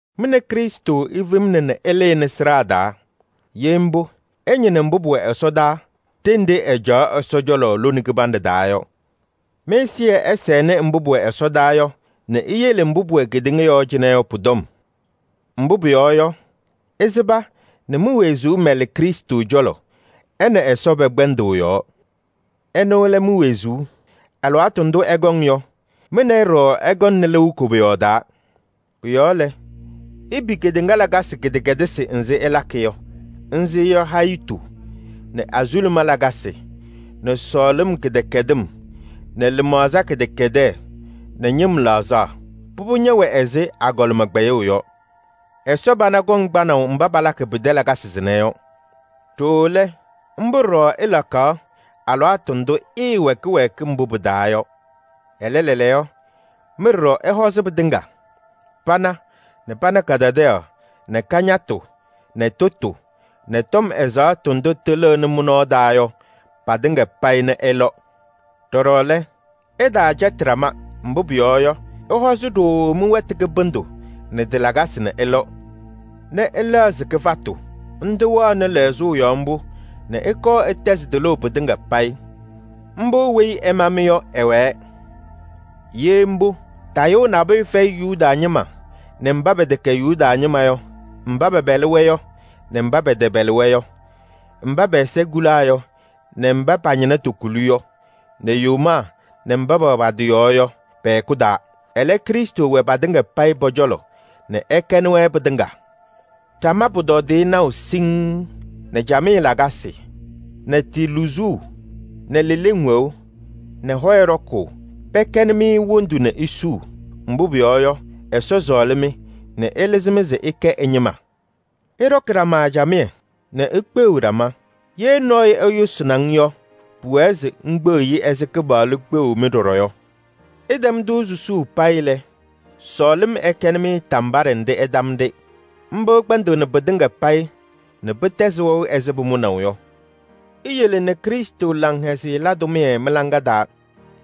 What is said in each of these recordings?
Mɩ nɛ Krɩstʋ ifemna nɛ ɩlɩnɩ sɩɖaa taa. Ye mbʋ, ɩñɩnɩ mbʋ pʋwɛ ɛsɔdaa ɖenɖe ɛcaɣ Ɛsɔ cɔlɔ lone kɩbanɖɛ taa yɔ. Mɩ-ɛzɩyɛ ɛsɛnɩ mbʋ pʋwɛ ɛsɔdaa yɔ nɛ iyele mbʋ pʋwɛ kedeŋa yɔɔ cɩnɛ yɔ pʋ-tɔm. Mbʋ pʋyɔɔ yɔ, ɩsɩba nɛ mi-wezuu mɛlɩ Krɩstʋ cɔlɔ ɛ nɛ Ɛsɔ pɛ-kpɛndʋʋ yɔɔ. Ɛnʋ lɛ mi-wezuu. Alɩwaatʋ ndʋ ɛkɔŋ yɔ, mɩ nɛ ɩ ɖɔɖɔ ɩkɔŋnɩ lɩʋ koboyaɣ taa. Pʋ-yɔɔ lɛ, ipi kedeŋa lakasɩ kɩdɛkɛdɩsɩ nzɩ ɩlakɩ yɔ. Nzɩ yɔ: hayitu nɛ azuluma lakasɩ nɛ sɔɔlɩm kɩdɛkɛdɩm nɛ lɩmaɣza kɩdɛkɛdɛɛ nɛ ñɩm laɣzaɣ. Pʋbʋ ñɛwɛ ɛzɩ agɔlɩma kpɛyʋʋ yɔ. Ɛsɔ pana kɔŋ kpanaʋ mba palakɩ pɩtɛ lakasɩ sɩnɛ yɔ. Ɖooo lɛ, mbʋ ɖɔɖɔ ɩlakaɣ alɩwaatʋ ndʋ ɩɩwɛ kɩwɛɛkɩm mbʋ pɩ-taa yɔ. Ɛlɛ lɛɛlɛɛyɔ, mɩ ɖɔɖɔ ɩhɔzɩ: pana nɛ pana kadadaɣyaɣ nɛ kañatʋ nɛ tʋtʋ nɛ tɔm ɛzaɣtʋ ndʋ tɩlɩɣnɩ mɩ-nɔɔ taa yɔ patɩŋa payɩ nɛ ɩlɔ. Ɖɔɖɔ lɛ, ɩtaacɛtɩ ɖama, mbʋ pʋyɔɔ yɔ, ɩhɔzɩ ɖooo mɩ-wɛtʋ kɩbɩndʋ nɛ tɩ-lakasɩ nɛ ɩlɔ nɛ ɩlɛɣzɩ kɩfatʋ. Ndʋ wɛɣnɩ lɛɣzʋʋ yɔɔ mbʋ nɛ ɩkɔɔ ɩtɛzɩ tɩlʋʋ pɩtɩŋa payɩ. Mbʋ weyi ɛma-mɩ yɔ, ɛwɛɛ. Ye mbʋ, tayʋʋ nabʋyʋ fɛyɩ Yuda ñɩma nɛ mba pɛtɛkɛ Yuda ñɩma yɔ, mba pɛpɛlɩ-wɛ yɔ nɛ kɩtɛpɛlɩŋ, mba pɛ-ɛza kulaa yɔ nɛ mba pa-ñɩna tokuli yɔ, nɛ yomaa nɛ mba pɛwɛ pa-tɩ yɔɔ yɔ pɛ-hɛkʋ taa. Ɛlɛ, Krɩstʋ wɛ patɩŋa payɩ pɔ-cɔlɔ nɛ ɛkɛnɩ-wɛ pɩtɩŋa. Ɖama pʋtɔdɩyɛ naʋ siŋŋ nɛ camɩyɛ lakasɩ nɛ tɩ luzuu nɛ leleŋ wɛʋ nɛ hɔyɛ ɖɔkʋʋ, pɛkɛnɩ-mɩ wondu nɛ isuu. Mbʋ pʋyɔɔ yɔ, Ɛsɔ sɔɔlɩ-mɩ nɛ ɛlɩzɩ-mɩ se ɩkɛ ɛ-ñɩma. Ɩɖɔkɩ ɖama camɩyɛ nɛ ikpeɣiɣ ɖama. Ye nɔɔyʋ ɛyʋsɩnɩ-ŋ yɔ, pʋwɛɛ se ŋkpeɣ-i ɛzɩ Kɩpaɣlʋ kpeɣu-mɩ ɖɔɖɔ yɔ. Ɩtɛm-tʋ suu payɩ lɛ, sɔɔlɩm ɛkɛnɩ-mɩ tambaɖɛ nɛ ɩtam-ɖɩ: mbʋ kpɛndɩɣnɩ pɩtɩŋa payɩ nɛ pɩtɛzɩ wɛʋ ɛzɩ pʋmʋnaʋ yɔ. Iyele nɛ Krɩstʋ laŋhɛzɩyɛ la tʋmɩyɛ mɩ-laŋa taa,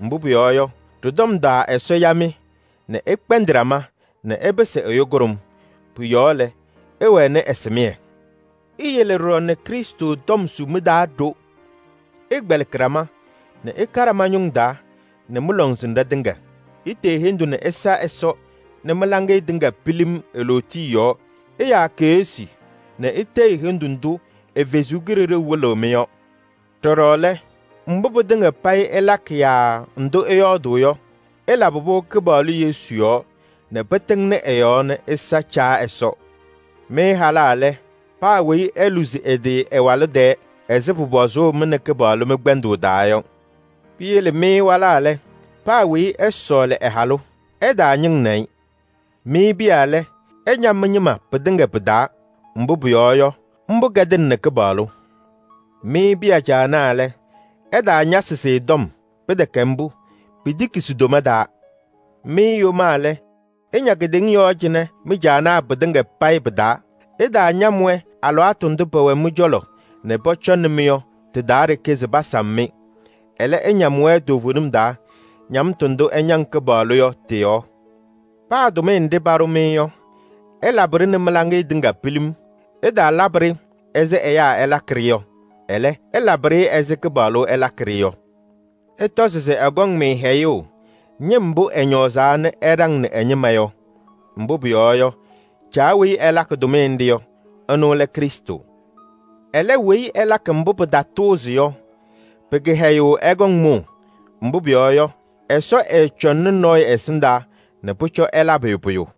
mbʋ pʋyɔɔ yɔ, ɖɩ-tɔm taa Ɛsɔ ya-mɩ nɛ ɩkpɛndɩ ɖama nɛ ɩpɩsɩ ɛyʋ kʋɖʋm. Pʋ-yɔɔ lɛ, ɩwɛnɩ ɛsɩmɩyɛ. Iyele ɖɔɖɔ nɛ Krɩstʋ tɔm su mɩ-taa ɖo: ɩkpɛlɩkɩ ɖama nɛ ɩka ɖama ñʋŋ taa nɛ mɩ-lɔŋsɩnɖɛ tɩŋa. Itee hendu nɛ ɩsa Ɛsɔ nɛ mɩ-laŋɩyɛ tɩŋa pilim e-lootiye yɔɔ: ɩyaa keɣsi nɛ itee-i hendu ndʋ ndʋ ɛ-Kalɩzaɣ wɩlɩɣ-mɩ yɔ. Ɖɔɖɔ lɛ, mbʋ pɩtɩŋa payɩ ɩlakɩ yaa ndʋ ɩyɔɔdʋʋ yɔ, ɩlabɩ-pʋ Kɩpaɣlʋ Yesu yɔɔ nɛ pɩtɩŋnɩ ɛ-yɔɔ nɛ ɩsa Caa Ɛsɔ. Mɩ halaa lɛ, paa weyi eluzi ɛ-tɩ ɛ-walʋ tɛɛ ɛzɩ pʋpɔzʋʋ mɩ nɛ Kɩpaɣlʋ mɩ-kpɛndʋʋ taa yɔ. Piyele mɩ walaa lɛ, paa weyi ɛsɔɔlɩ ɛ-halʋ, ɛtaañɩŋnɩ-ɩ. Mɩ piya lɛ, ɩña mɩ-ñɩma pɩtɩŋa pɩ-taa, mbʋ pʋyɔɔ yɔ, mbʋ kɛdɩnɩnɩ Kɩpaɣlʋ. Mɩ piya caanaa lɛ, ɩtaañasɩ-sɩ tɔm, pɩtɛkɛ mbʋ, pitiki si-toma taa. Mɩ yomaa lɛ, ɩña kedeŋa yɔɔ cɩnɛ mɩ-caanaa pɩtɩŋa payɩ pɩ-taa. Ɩtaañam-wɛ alɩwaatʋ ndʋ pɛwɛ mɩ-cɔlɔ nɛ pɔcɔŋnɩ-mɩ yɔ tɩ-taa ɖeke se pasam-mɩ. Ɛlɛ, ɩñam-wɛ toovenim taa, ñamtʋ ndʋ ɩñaŋ Kɩpaɣlʋ yɔ tɩ-yɔɔ. Paa tʋmɩyɛ nɖɩ paɖʋ-mɩ yɔ, ɩlabɩ-ɖɩ nɛ mɩ-laŋɩyɛ tɩŋa pilim. Ɩtaalabɩ-ɖɩ ɛzɩ ɛyaa ɩlakɩ-ɖɩ yɔ, ɛlɛ, ɩlabɩ-ɖɩ ɛzɩ Kɩpaɣlʋ ɩlakɩ-ɖɩ yɔ. Ɩtɔzɩ se ɛkɔŋ-mɩ hɛyʋʋ ñɩm mbʋ ɛñɔɔzaa nɛ ɛɖaŋnɩ ɛ-ñɩma yɔ. Mbʋ pʋyɔɔ yɔ, Caa weyi ɩlakɩ tʋmɩyɛ nɖɩ yɔ, ɛnʋ lɛ Krɩstʋ. Ɛlɛ, weyi ɛlakɩ mbʋ pɩtatʋʋzɩ yɔ, pɩ-kɩhɛyʋʋ ɛkɔŋ mʋʋ, mbʋ pʋyɔɔ yɔ, Ɛsɔ ɛɛcɔŋnɩ nɔɔyʋ ɛsɩndaa se pʋcɔ ɛlabɩ-ɩ pʋyʋ.